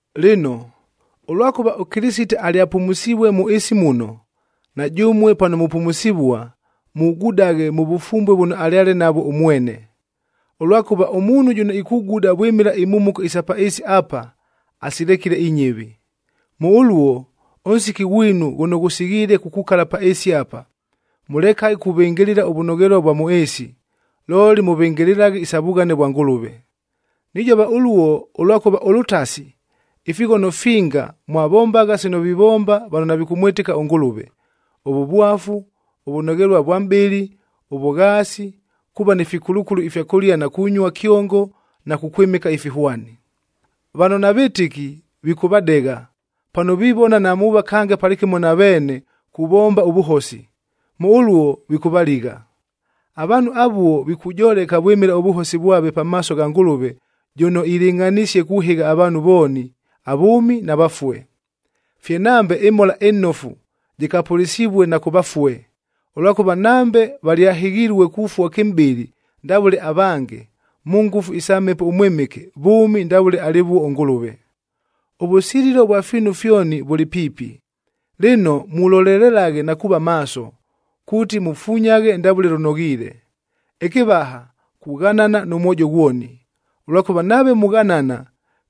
Lɨno, ʉlwakʉva ʉKɨlɨsite alyapumusivue mʉ ɨɨsi muno, na jʉmue pano mupumusivua, mugudaghe mʉ vʉfumbue vʉno alyale navwo ʉmwene. Ʉlwakʉva ʉmuunhu jʉno ikuguda vwɨmɨla imhumuko isa pa ɨɨsi apa, asilekile inyɨvi. Mʉ ʉluo, ʉnsiki ghwinu ghʉno ghʉsighiile kukukala pa ɨɨsi apa, mʉlekaghe kuvɨngɨlɨla ʉvʉnoghelua ʉvwa mʉ ɨɨsi, looli mʉvɨngɨlɨlaghe isa vughane vwa Ngʉlʉve. Nijova ʉluo, ʉlwakʉva ʉlʉtasi, ifighono finga mwavombagha sino vivomba vano navikʉmwɨtɨka ʉNgʉlʉve: ʉvʉvwafu, ʉvʉnoghelua vwa mʼbɨlɨ, ʉvʉghaasi, kuuva ni fikulukulu ifya kʉlia na kunyua kyongo na kukwɨmɨka ifihwani. Vano navɨtɨki vikʉvadegha, pano vivona namuuva kange palɨkɨmo na veene kuvomba ʉvʉhosi, mʉ ʉluo vikʉvaligha. Avaanhu avuo, vilikujoleka vwɨmɨla ʉvʉhosi vwave pamaaso gha Ngʉlʉve jʉno ilɨngʼhanisie kuhɨgha avaanhu vooni, avʉʉmi na vafue. Fye nambe ɨMhola ɨNofu jɨkapʉlɨsivue na kʉ vafue, ʉlwakʉva nambe valyahɨghilue kufua kɨmʼbɨlɨ ndavʉle avange, mʉ ngʉfu isa Mhepo ʉMwɨmɨke, vʉʉmi ndavʉle alɨvuo ʉNgʉlʉve. Ʉvʉsililo ʉvwa fiinu fyoni vʉlɨ piipi, lɨno mulolelelaghe na kuuva maaso, kuuti mufunyaghe ndavʉle lʉnoghiile. Ɨkɨvaha, kughanana nʉ mwojo ghwoni, ʉlwakʉva nave mughanana,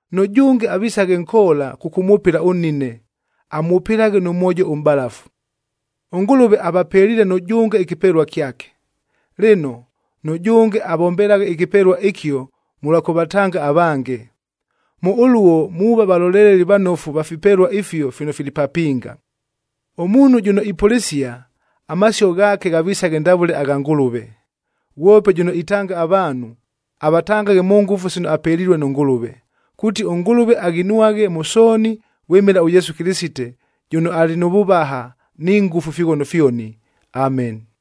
Nʉjʉnge avisaghe nkoola kʉkʉmwʉpɨla ʉnnine. Amwʉpɨlaghe nʉ mwojo ʉmʼbalafu. ɄNgʉlʉve avapeliile nʉjʉnge ɨkɨpelua kyake. Lɨno, nʉjʉnge avombelaghe ɨkɨpelua ɨkio mʉlwa kʉvatanga avange. Mʉ ʉluo muuva valoleleli vanofu va fipelua ifio fino fili papinga. Ʉmuunhu jʉno ipʉlɨsia, amasio ghaake ghavisaghe ndavʉle agha Ngʉlʉve. Ghwope jʉno itanga avaanhu, avatangaghe mʉ ngʉfu sino apelilue nʉ Ngʉlʉve, kuuti ʉNgʉlʉve aghinwaghe mʉ sooni vwɨmɨla ʉYesu Kɨlɨsite, jʉno alɨ nʉ vʉvaha ni ngʉfu ifighono fyoni. Ameni.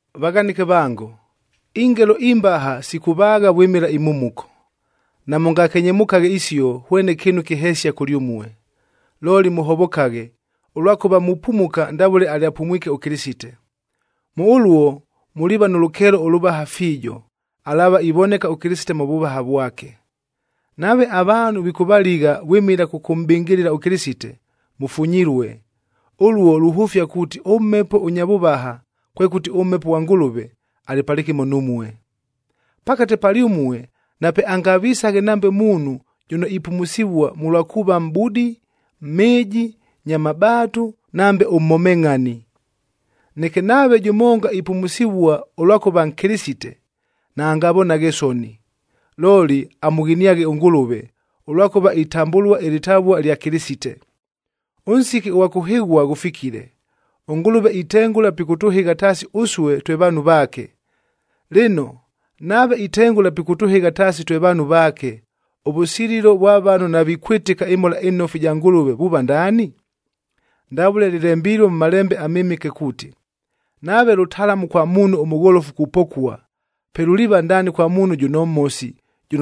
Vaghanɨke vango, ingelo imbaha sikʉvaagha vwɨmɨla imhumuko. Namʉngakenyemʉkaghe isio hwene kɨɨnu kɨhesia kʉlyʉmue. Looli mʉhovokaghe, ʉlwakʉva mupumuka ndavʉle alyapumwike ʉKɨlɨsite. Mʉ ʉluo muliiva nʉ lʉkeelo ʉlʉvaha fiijo, alaava ivoneka ʉKɨlɨsite mʉ vʉvaha vwake. Nave avaanhu vikʉvaligha vwɨmɨla kʉkʉmʼbɨngɨlɨla ʉKɨlɨsite, mʉfunyilue, ʉluo luhʉfia kuuti ʉMhepo ʉnya vʉvaha, kwekʉti ʉMhepo ghwa Ngʉlʉve, alɨ palɨkɨmo numue. Pakate palyʉmue napeangavisaghe nambe muunhu jʉno ipumusivua mʉlwa kuuva mʼbudi, mhɨɨji, nya mabaatu, nambe ʉmhomengʼhani. Neke nave jʉmonga ipumusivua ʉlwakʉva Nkɨlɨsite, naangavonaghe soni, looli amʉghiniaghe ʉNgʉlʉve, ʉlwakʉva itambʉlua ɨlɨtavua lya Kɨlɨsite. Ʉnsiki ʉghwa kʉhɨghua ghʉfikile. ɄNgʉlʉve itengʉla pikʉtʉhɨgha taasi ʉsue twe vaanhu vaake. Lɨno, nave itengʉla pikʉtʉhɨgha taasi twe vaanhu vaake, ʉvʉsililo vwa vano navikwɨtɨka ɨMhola ɨNofu ɨja Ngʉlʉve vuuva ndaani? Ndavʉle lɨlembilue mʉ Malembe aMɨmɨke kuuti, “Nave lʉtalamu kwa muunhu ʉmʉgholofu kupokua, pe luliiva ndaani kwa muunhu jʉno mhosi,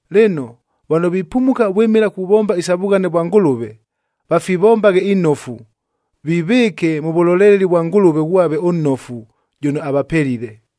Lɨno, vano vipumuka vwɨmɨla kuvomba isa vughane vwa Ngʉlʉve, vafivombaghe inofu, vivɨɨke mʉ vʉloleleli vwa Ngʉlʉve ghwave ʉnnofu, jʉno avapelile.